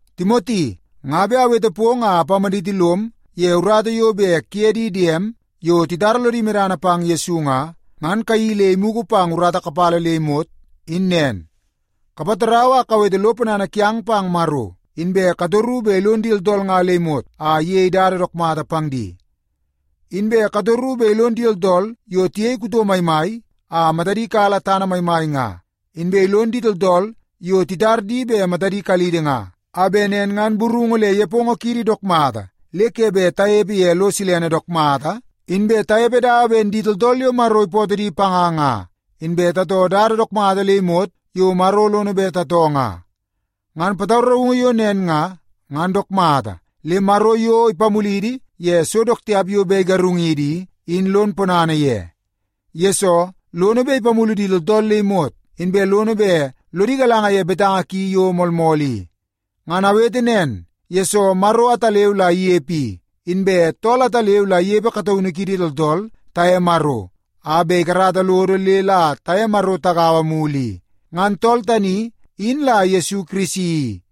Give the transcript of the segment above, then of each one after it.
Timoti, nga bet awete pong a apamaditi lom ye urata yo bet kuye di diem, yo titara lodi medana pang Yesu nga, ngan kayeii le imugu pang urata kapala le imot, in nen. Kapatarau a kawete lo ponana kiang pang Maro, inbe katoru bet ilon di tooltool nga le imot a iyei dada dook mata pang di. Inbe katoru bet ilon di tooltool yo tiyei kuto maimai a matadi kala tana maimai nga, inbe ilon di tooltool yo titar di bet matadi kalidi nga, a bet nen ngan burungu le nepongo kiidi dook mata ke bet tanepe ye lo silene dook mata, inbe tanepe dawa ben di tooltool yo Maro ipootoo di panga nga, inbe tatoo dada dook mata le imot yo Maro lono bet tatoo nga. Ngan pataraungu yo nen nga, ngan dook mata, le Maro yo ipamulidi ye so dook tiap yo bet igarungidi i, in lon ponana ye. Yesoo, lono bet ipamulu di tooltool le imot, inbe lono bet lodi galanga ye betanga ki yo moolmool i. Ngan awete nen, yesoo Maro ataleu la inepe i, inbe tool ataleu la inepe kataunu kiidi tooltool taye Maro a bet ikarata lodo le la taye Maro tagaua mulu i. Ngan tool tani, in la Yesu Kirisi,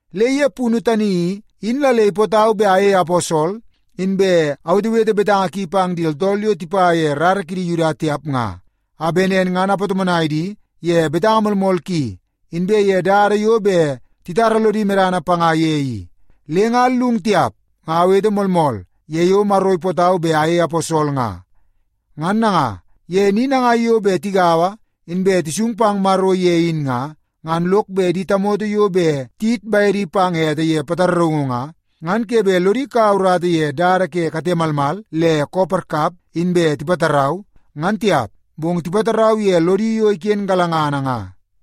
Le ye punu tani i, in la le ipootau bet ayei aposol inbe awetewete betanga ki pang di tooltool yo tipa ye rara kidi Yuda tiap nga, a bet nen ngan apatomonai di ye betanga moolmool ki inbe ye dada yo bet titara lodi medana panga ye i. Le nga allung tiap, nga awete moolmool ye yo Maro ipootau bet ayei aposol nga. Ngan nanga, ye ni nangai yo bet tigaua inbe tisung pang Maro ye in nga, ngan lok bet di tamoto yo bet tiyit bedi pang ete ye pataraungu nga, ngan ke bet lodi kaua urata ye dada ke kate malmal le koo parkap inbe tipatarau, ngan tiap. Bong tipatarau ye lodi yo iken galangana nga.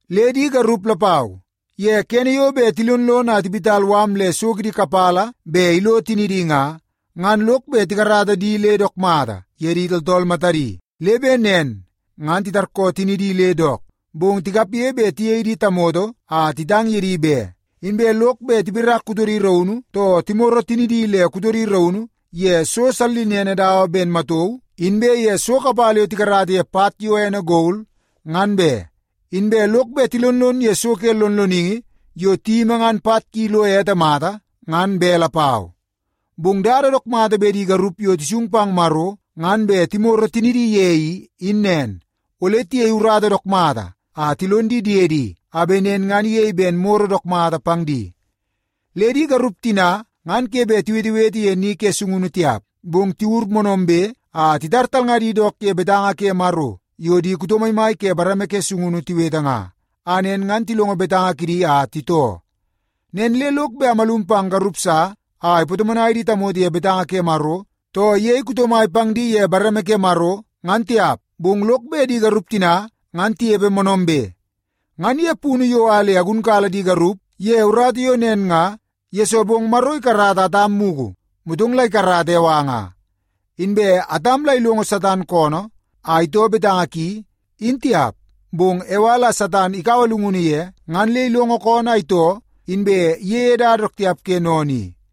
Le di garup lapau, ye kene yo bet tilonlon a tiwit mala le so kidi kapala bet ilo tinidi nga, ngan lok bet tikarata di le dook mata ye di tooltool matadi. Le bet nen ngan titarkoo tinidi le dook, bong tikapge bet tiyei di tamoto a titang ye di be. Inbe lok bet tipirak kutodi raunu, too timoro tinidi le kutodi raunu ye so sallinene dawa ben matauu inbe ye so kapala yo tikarata ye pat yo ene gol, ngan be. Inbe lok bet tilonlon ye so ke lonloningi yo tiyimi ngan pat ki lo ete mata, ngan be lapau. Bong dada dook mata bet di garup yo tisung pang Maro ngan bet timoro tinidi ye, in nen. Ole tiyei urata dook mata a tilon di diedi a bet nen ngan iyei ben moro dook mata pang di. Le di garup tina ngan ke bet tiwetewete ye ni ke sungunu tiap, bong tiwur moonoombe a titar talngadi dook ye betanga ke Maro yo di kuto maimai ke bareme ke sungunu tiwete nga, a nen ngan tilongo betanga kidi a titoo. Nen le lok bet amalum pang garup sa a ipatomonai di tamoto ye betanga ke Maro, too iyei kuto mai pang di ye bareme ke Maro, ngan tiap. Bong lok bet di garup tina ngan tinepe moonoombe. Ngan ye punu yo a le agunkala di garup ye urata yo nen nga, yesoo bong Maro ikarata Atam mugu, motong la ikarata Ewa nga. Inbe Atam la ilongo Satan koonoo a itoo betanga ki, in tiap. Bong Ewa la Satan ikaua llungunu ye, ngan le ilongo koonoo a itoo, inbe iyeie dada dook tiap ke sennene i.